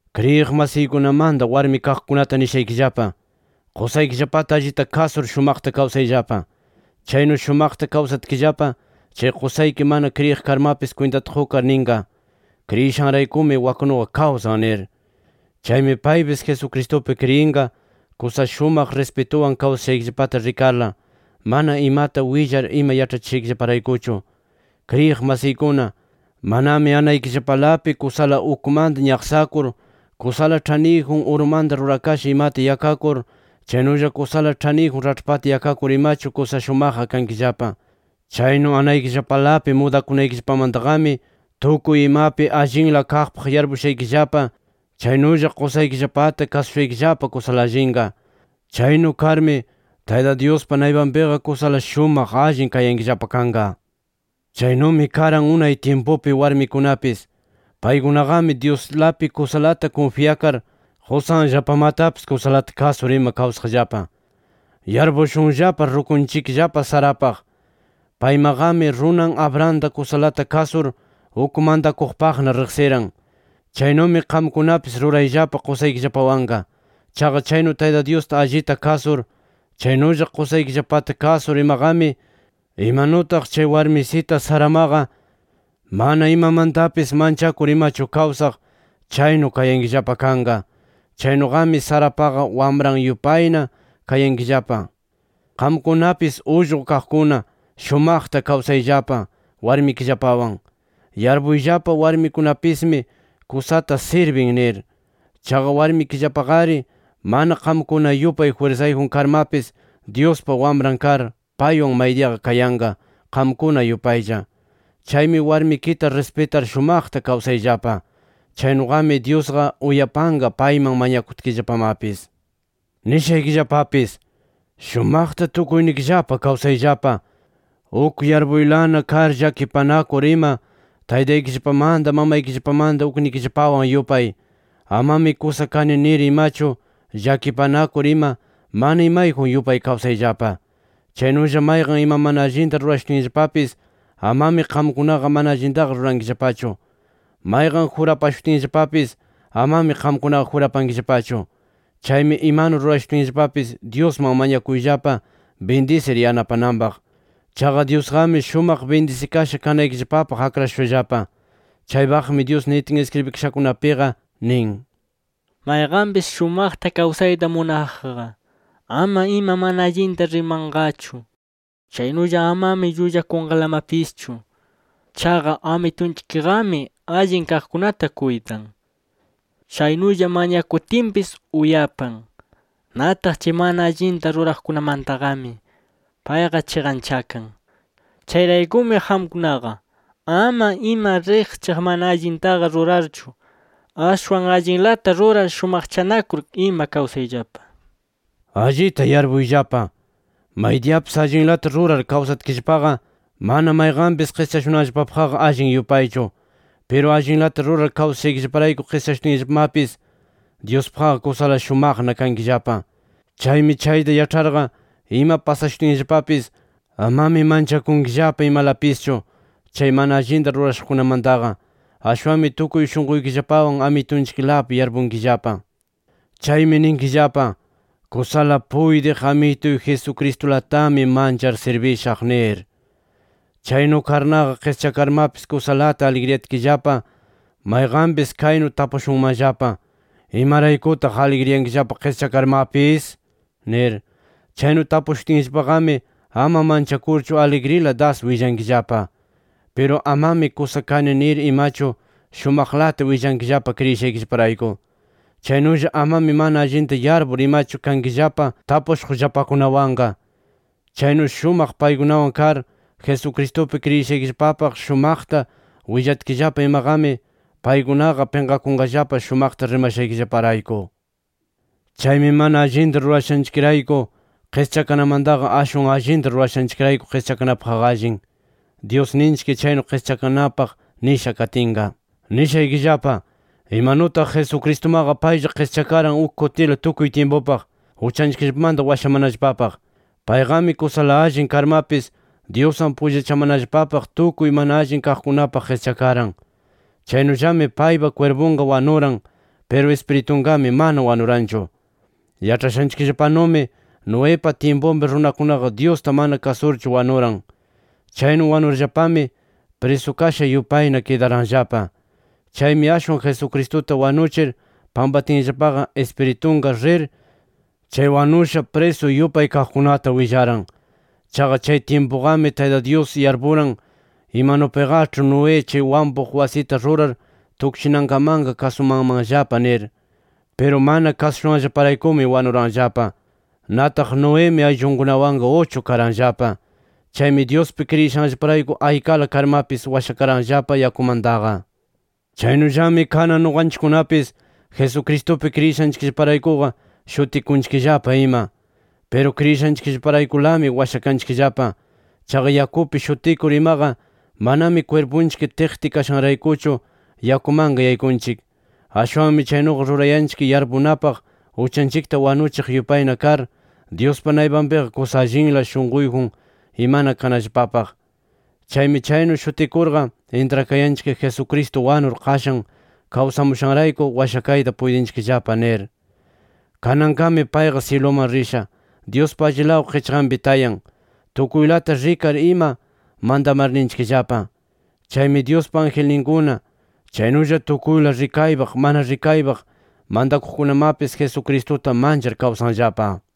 Kriyiq masiykunamanta, warmi kaqkunata nishaykillapa: Qusaykillapata allita kasur shumaqta kawsayllapa. Chaynu shumaqta kawsatkillapa, chay qusayki mana kriyiq karmapis kwintata qukar ninqa: “Kriyishanraykumi waknuqa kawsan” nir. Chaymi paypis Jesucristupi kriyinqa, kusa shumaq rispituwan kawsashaykillapata rikarla, mana imata willar ima yaĉhachishaykillaparaykuchu. Kriyiq masiykuna, manami anaykillapalapi kusala ukmanta ñaqsakur, kusala ĉhaniyjun urumanta rurakasha imata yakakur chaynulla kusala ĉhaniyjun raĉhpata yakakur imachu, kusa shumaqqa kankillapa. Chaynu anaykillapalapi mudakunaykillapamantaqami, tukuy imapi allinla kaqpaq yarpushaykillapa, chaynulla qusaykillapata kasushaykillapa kusala allinqa. Chaynu karmi, Tayta Dyuspa naypanpiqa kusala shumaq allin kayankillapa kanqa. Chaynumi karan unay tyimpupi warmikunapis. Paykunaqami Dyuslapi kusalata kunfyakar, qusanllapamatapis kusalata kasur ima kawsaqllapa. Yarpushunllapa rukunchikllapa Sarapaq. Paymaqami runan Abrahamta kusalata kasur, uk mantakuqpaqna riqsiran. Chaynumi qamkunapis rurayllapa qusaykillapawanqa. Chaqa chaynu Tayta Dyusta allita kasur, chaynulla qusaykillapata kasur imaqami, imanutaq chay warmisita Saramaqa mana imamantapis manchakur imachu kawsaq, chaynu kayankillapa kanqa. Chaynuqami Sarapaqa wamran yupayna kayankillapa. Qamkunapis ullqu kaqkuna, shumaqta kawsayllapa warmikillapawan. Yarpuyllapa: Warmikipismi kusata sirbin nir. Chaqa warmikillapaqari mana qamkuna yupay jwirsayjun karmapis, Dyuspa wamran kar, paywan maydiya kayanqa, qamkuna yupaylla. Chaymi warmikita rispitar shumaqta kawsayllapa. Chaynuqami Dyusqa uyapanqa payman mañakutkillapamapis. Nishaykillapapis: Shumaqta tukuynikillapa kawsayllapa, uk yarpuylana kar llakipanakur ima taytaykillapamanta mamaykillapamanta uknikillapawan yupay. Amami kusa kani nir imachu, llakipakur ima mana imayjun yupay kawsayllapa. Chaynulla mayqan ima mana allinta rurashutinllapapis, amami qamkunaqa mana allintaqa rurankillapachu. Mayqan jurapashutinllapapis, amami qamkunaqa jurapankillapachu. Chaymi imanu rurashutinllapapis Dyusman mañakuyllapa bindisir yanapananpaq. Chaqa Dyusqami shumaq bindisikasha kanaykillapapaq akrashushallapa. Chaypaqmi Dyus nitin iskribikashankunapiqa nin: “Mayqanpis shumaqta kawsayta munaqqa, ama ima mana allinta rimanqachu. Chaynulla amami llullakunqalamapischu. Chaqa Amitunchikqami allin kaqkunata kuytan. Chaynulla mañakutinpis uyapan. Nataq chay mana allinta ruraqkunamantaqami payqa chiqanchakan. Chayraykumi qamkunaqa, ama ima riqchaq mana allintaqa rurarchu, ashwan allinlata rurar shumaqchanakur ima kawsayllapa”. Allita yarpuyllapa: Maydiyapis allinlata rurar kawsatkillapaqa, mana mayqanpis qischashunanllapapaqqa allin yupaychu. Piru allinlata rurar kawsashaykirayku qischashutinllapamapis, Dyuspaqqa kusala shumaqna kankillapa. Chaymi chayta yaĉharqa, ima pasashutinllapapis amami manchakunkillapa imalapischu, chay mana allinta rurashuqkunamantaqa. Ashwanmi tukuy shunquykillapawan Amitunchiklapi yarpukunkillapa. Chaymi ninkillapa: “Kusala puytiq Amituy Jesucristulatami manchar sirbishaq” nir. Chaynu karnaqa qischakarmapis kusalata aligriyatkillapa, mayqanpis kaynu tapushunmanllapa: ¿Imaraykutaq aligriyankillapa qischakarmapis? nir. Chaynu tapushutinllapaqami, ama manchakurchu aligrila das willankillapa. Piru amami kusa kani nir imachu, shumaqlata willankillapa kriyishaykillaparayku. Chaynulla amami mana allinta yarpur imachu kankillapa tapushuqllapakunawanqa. Chaynu shumaq paykunawan kar, Jesucristupi kriyishaykillapapaq shumaqta willatkillapa imaqami paykunaqa pinqakunqallapa shumaqta rimashaykillaparayku. Chaymi mana allinta rurashanchikrayku qischakanamantaqa, ashwan allinta rurashanchikrayku qischakanapaqqa allin, Dyusninchik chaynu qischakanapaq nisha katinqa. Nishaykillapa, imanutaq Jesucristumaqa, paylla qischakaran uk kutila tukuy tyimpupaq, uchanchikllapamanta washamanallapapaq. Payqami kusala allin karmapis Dyuswan pullachamanallapapaq tukuy mana allin kaqkunapaq qischakaran. Chaynullami paypa kwirpunqa wanuran, piru Ispiritunqami mana wanuranchu. Yaĉhashanchikllapanumi Noepa tyimpunpi runakunaqa Dyusta mana kasurchu wanuran. Chaynu wanurllapami prisukasha yupayna kidaranllapa. Chaymi ashwan Jesucristuta wanuchir pampatinllapaqa Ispiritunqa rir, chay wanusha prisu yupay kaqkunata willaran. Chaqa chay tyimpuqami Tayta Dyus yarpuran, imanupiqaĉhi Noé chay wampuq wasita rurar tukchinankamanqa kasumanmanllapa nir. Piru mana kasushanllaparaykumi, wanuranllapa. Nataq Noemi ayllunkunawanqa uchu karanllapa. Chaymi Dyuspi kriyishanllaparayku aykala karmapis washakaranllapa yakumantaqa. Chaynullami kanan nuqanchikkunapis Jesucristupi kriyishanchikraykuqa shutikunchikllapa ima. Piru kriyishanchikraykulami washakanchikllapa. Chaqa yakupi shutikur imaqa manami kwirpunchik tiqti kashanraykuchu yakumanqa yaykunchik. Ashwanmi chaynuqa rurayanchik yarpunapaq uchanchikta wanuchiq yupayna kar, Dyuspa naypanpiqa kusa allinla shunquyjun imana kanallapapaq. Chaymi chaynu shutikurqa intrakayanchik Jesucristo wanur, qashan kawsamushanrayku, washakayta puytinchikllapa nir. Kananqami payqa syiluman risha, Dyuspa allilaw qichqanpi tayan, tukuylata rikar ima mantamarninchikllapa. Chaymi Dyuspa angelninkuna, chaynulla tukuyla rikaypaq mana rikaypaq mantakuqkunamapis Jesucristuta manchar kawsanllapa.